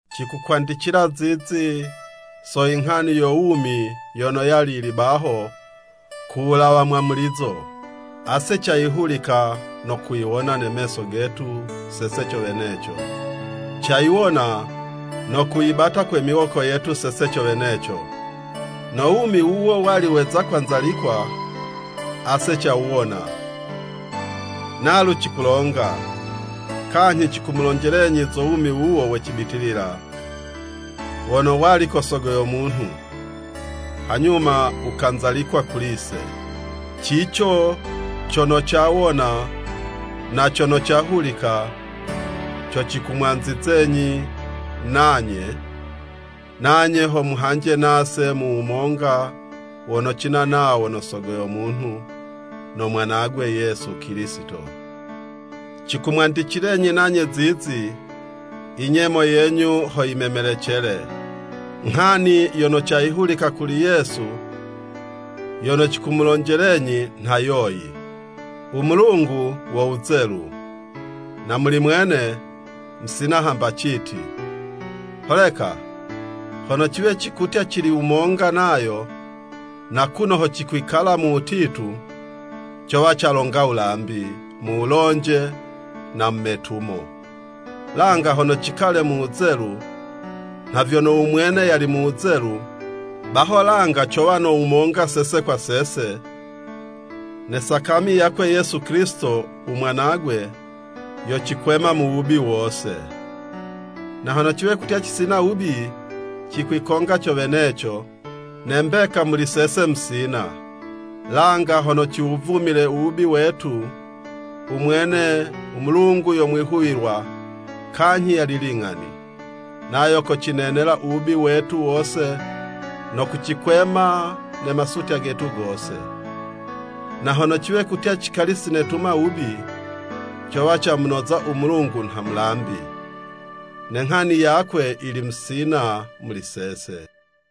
Cikukwandicila zizi so i nghani yo wumi yono yali yili baho ku wulawa mwamulizo. Ase cayihulika no kuyiwona ne meso getu sese co weneco, cayiwona no kuyibata kwe miwoko yetu sese co weneco. No wumi wuwo wali weza kwanzalikwa, ase cawuwona, nalu cikulonga, kanyhi cikumulonjelenyi zo wumi wuwo we cibitilila, wono wali ko Sogo yo munhu, hanyuma wukanzalikwa kuli'se. Cico cono cawona, na cono cahulika, co cikumwanzizenyi nanye, nanye ho muhanje nase mu wumonga wono cina nawo no Sogo yo munhu no Mwanagwe Yesu Kilisito. Cikumwandicilenyi nanye zizi, i nyemo yenyu ho yimemelecele. I nghani yono cayihulika kuli Yesu, yono cikumulonjelenyi, nha yoyi, u Mulungu wo wuzelu, na muli mwene, musina hamba citi. Holeka hono ciwe kutya cili wumonga nayo, na kuno ho cikwikala mu wutitu, cowa calonga wulambi mu wulonje na mu metumo. Langa hono cikale mu wuzelu, nha vyono u mwene yali mu wuzelu, baho langa cowa no wumonga sese kwa sese, ne sakami yakwe Yesu Kilisito u Mwanagwe, yocikwema mu wubi wose. Na hono ciwe kutya cisina wubi, cikwikonga co weneco, ne mbeka muli sese musina. Langa hono ciwuvumile u wubi wetu, u mwene u Mulungu yo mwihuwilwa, kanyhi yali ling'ani, nayo kocinenela u wubi wetu wose, no kucikwema ne masutya getu gose. Na hono ciwe kutya cikali sinetuma wubi, cowa camunoza u Mulungu nha mulambi, ne nghani yakwe yili musina muli sese.